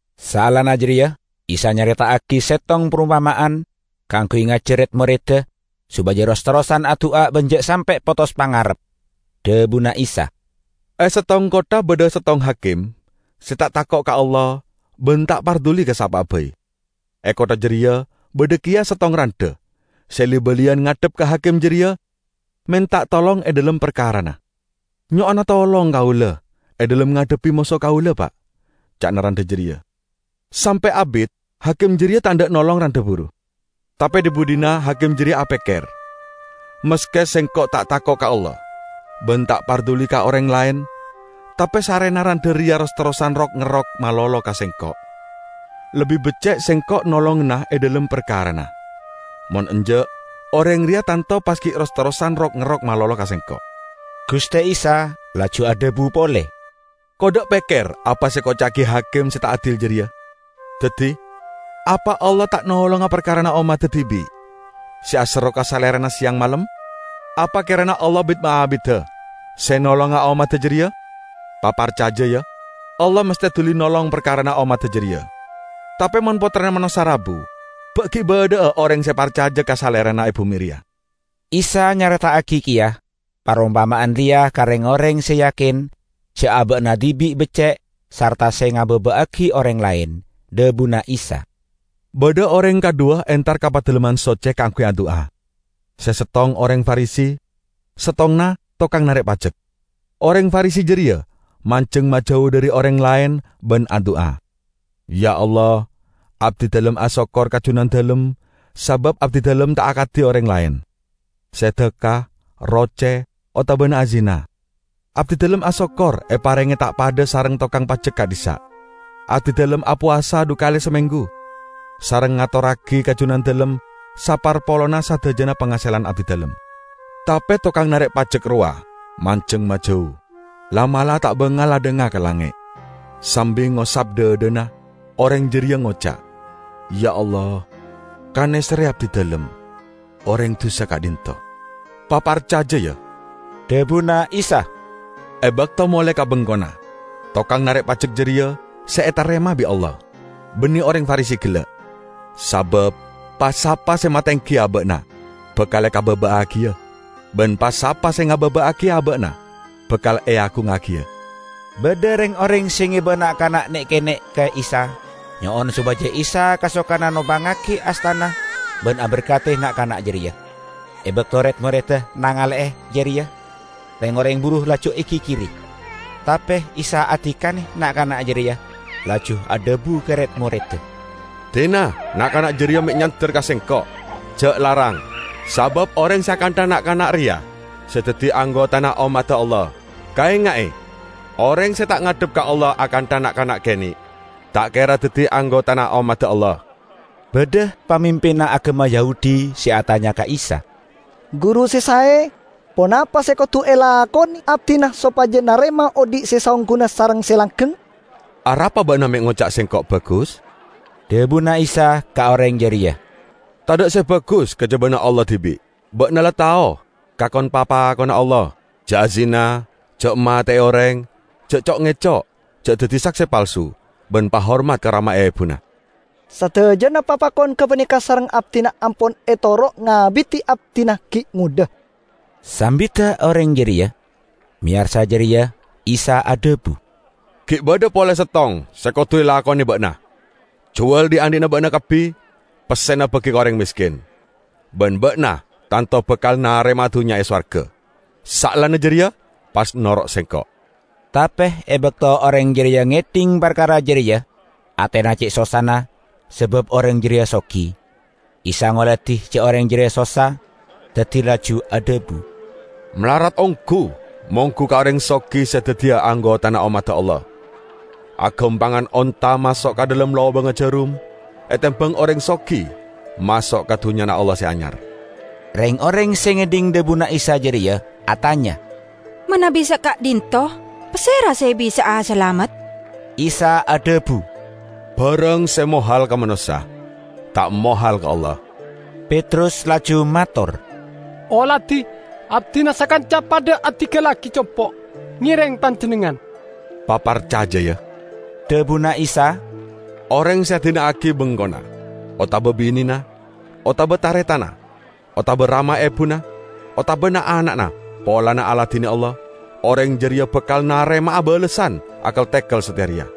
Saellana jareya Isa nyareta'agi settong parompama'an kaangguy ngajar red-moredda sopaja ros-terrosan adu'a ban ja' sampe' potos pangarep. Dhabuna Isa, "E settong kottha badha settong hakim se ta' tako' ka Allah ban ta' parduli ka sapa'a bai. E kottha jareya badha keya settong randha se li-baliyan ngadhep ka hakim jareya menta tolong e dhalem parkarana. 'Nyo'ona tolong kaula e dhalem ngadhebbi moso kaula, Pa',' ca'na randha jareya. Sampe' abit hakim jareya ta' endha' nolong randha buru. Tape dhi-budhina hakim jareya apekker, 'Maske sengko' ta' tako' ka Allah ban ta' parduli ka oreng laen, tape sarrena randha reya ros-terrosan rok-ngerok malolo ka sengko', lebbi becce' sengko' nolongana e dhalem parkarana. Mon enja', oreng reya tanto pas gi' ros-terrosan rok-ngerok malolo ka sengko'.' " Guste Isa laju adhabu pole, "Kodda' pekker apa se ekoca'agi hakim se ta' adil jareya! Daddi, apa Allah ta' nolonga parkarana ommadda dibi' se aserro ka Salerana seyang malem? Apa kerana Allah bit-maabida se nolonga ommadda jareya? Paparcaja, ya: Allah masthe duli nolong parkarana ommadda jareya! Tape mon Pottrana Manossa rabu, ba' gi' badha'a oreng se parcaja ka Salerana e bume reya?" Isa nyareta'agi keya parompama'an reya ka reng-oreng se yakin ja' aba'na dibi' becce' sarta se ngababa'agi oreng laen. Dhabuna Isa, "Badha oreng kadhuwa entar ka Padalemman Socce kaangguy adu'a. Se settong oreng Farisi, settonganna tokang narek pajek. Oreng Farisi jareya manjeng majau dhari oreng laen ban adu'a, 'Ya, Allah, abdidalem asokkor ka Junandalem sabab abdidalem ta' akadi oreng laen, se dhakka, roce, otabana azina. Abdidalem asokkor eparenge ta' padha sareng tokang pajek ka'dhissa'. Abdidalem apowasa dhu kale samenggu, sareng ngatorragi ka Junandalem saparpolonna sadajana pangaselan abdidalem.' Tape tokang narek pajek rowa manjeng majau, la'-mala' ta' bangal adhanga ka langnge'. Sambi ngosap dhadhana oreng jareya ngoca', 'Ya, Allah, kaneserre abdidalem, oreng dusa ka'dhinto'!' " "Paparcaja, ya," dhabuna Isa, "e bakto mole ka bengkona, tokang narek pajek jareya se etarema bi' Allah, banne oreng Farisi gella'. Sabab pa-sapa se matenggi aba'na bakal ekababa'agiya, ban pa-sapa se ngababa'agi aba'na bakal eagungngagiya." Badha reng-oreng se ngeba na'-kana' ne'-kene' ka Isa nyo'on sopaja Isa kasokana nompangngagi astana ban aberkadi na'-kana' jareya. E bakto red-moredda nangale'e jareya, reng-oreng buru laju egigiri. Tape Isa adikane na'-kana' jareya laju adhabu ka red-moredda, "Dina na'-kana' jareya me' nyander ka Sengko'! Ja' larang, sabab oreng se akantha na'-kana' reya se daddi anggotana ommadda Allah. Kaenga'e! Oreng se ta' ngadhep ka Allah akantha na'-kana' kene', ta' kera daddi anggotana ommadda Allah." Badha pamimpinna agama Yahudi se atanya ka Isa, "Guru se sae, ponapa se kodu elakone abdina sopaja narema odhi' se saongguna sareng se langgeng?" "Arapa ba'na me' ngoca' Sengko' bagus?" dhabuna Isa ka oreng jareya. "Tadha' se bagus kajabana Allah dibi'. Ba'na la tao ka kon-papakonna Allah: 'Ja' azina, ja' mate'e oreng, ja' co'-ngeco', ja' daddi sakse palsu, ban pahormat ka rama ebuna.' " "Sadajana papakon gapaneka sareng abdina ampon etoro' ngabidi abdina gi' ngodha," sambidda oreng jareya. Meyarsa jareya Isa adhabu, "Gi' badha pole settong se kodu elakone ba'na: Juwal dhi'-andhi'na ba'na kabbi, pessena bagi ka oreng mesken, ban ba'na tanto bakal narema'a dunnya e sowarga. Saellana jareya pas noro' Sengko'." Tape e bakto oreng jareya ngedhing parkara jareya atena ce' sossana sabab oreng jareya sogi. Isa ngoladi ja' oreng jareya sossa, daddi laju adhabu, "Malarat onggu monggu ka oreng sogi se daddiya anggotana ommadda Allah! Agampangan onta maso' ka dhalem lobangnga jarum, etembang oreng sogi maso' ka Dunnyana Allah Se Anyar." Reng-oreng se ngedhing dhabuna Isa jareya atanya, "Manabi saka'dhinto, pasera se bisa'a salamet?" Isa adhabu, "Barang se mohal ka manossa, ta' mohal ka Allah!" Petrus laju mator, "Oladi! Abdina sakanca padha adinggallagi compo', ngereng Panjennengngan." "Paparcaja, ya!" dhabuna Isa. "Oreng se adina'agi bengkona otaba binena, otaba taretanna otaba rama ebuna otaba na'-ana'na polana aladine Allah, oreng jareya bakal narema'a balessan akel-tekel sateya reya,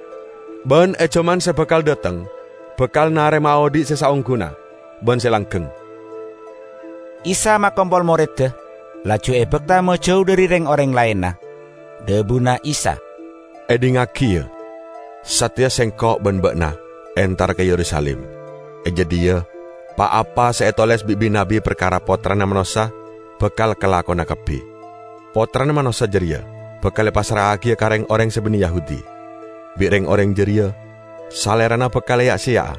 ban e jaman se bakal dhateng bakal narema'a odhi' se saongguna ban se langgeng." Isa makompol moredda, laju ebakta majau dhari reng-oreng laenna. Dhabuna Isa, "Edhingngagi, ya! Sateya Sengko' ban ba'na entara ka Yerusalim. E jadhiya, pa-apa se etoles bi' bi-nabbi parkara Pottrana Manossa bakal kalakona kabbi. Pottrana Manossa jareya bakal epassra'agiya ka reng-oreng se banne Yahudi; bi' reng-oreng jareya Salerana bakal eya'-seya'a,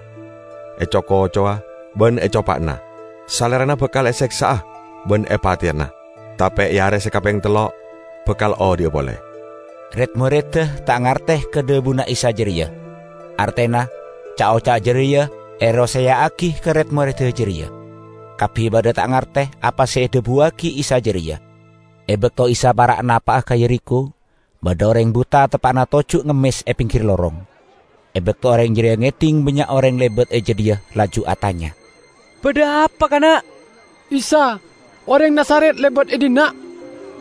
eco-kocowa, ban ecopa'ana. Salerana bakal eseksa'a ban epateyana, tape e are se kapeng tello' bakal odhi'a pole." Red-moredda ta' ngarte ka dhabuna Isa jareya. Artena ca'-oca' jareya eroseya'agi ka red-moredda jareya; kabbi padha ta' ngarte apa se edhabuwagi Isa jareya. E bakto Isa para' napa'a ka Yerikho, badha oreng buta teppa'na toju' ngemmes e penggir lorong. E bakto oreng jareya ngedhing bannya' oreng lebat e jadhiya laju atanya, "Badha apa, kana'?" "Isa, oreng Nazaret lebat e dhinna',"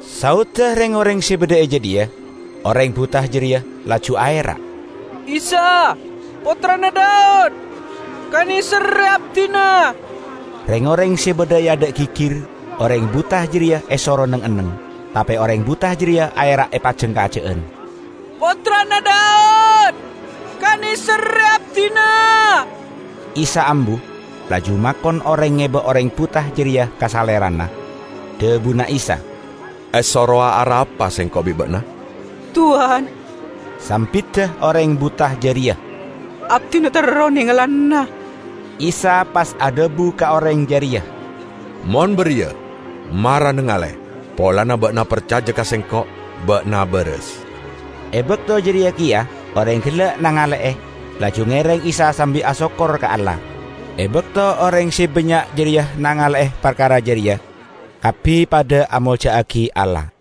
saodda reng-oreng se badha e jadhiya. Oreng buta jareya laju aera', "Isa, Pottrana Daud! Kaneserre abdina!" Reng-oreng se badha e adha' gigir, oreng buta jareya esoro neng-enneng. Tape oreng buta jareya aera' epajangkaja'an. "Pottrana Daud! Kaneserre abdina!" Isa ambu laju makon oreng ngeba oreng buta jareya ka Salerana. Dhabuna Isa, "Esorowa arapa Sengko' bi' ba'na?" "Towan," sambidda oreng buta jareya, "abdina terro nengalana." Isa pas adhabu ka oreng jareya, "Mon bariya, mara nangale! Polana ba'na parcaja ka Sengko', ba'na baras." E bakto jareya keya oreng gella' nangale'e, laju ngereng Isa sambi asokkor ka Allah. E bakto oreng se bannya' jareya nangale'e parkara jareya, kabbi padha amolja'agi Allah.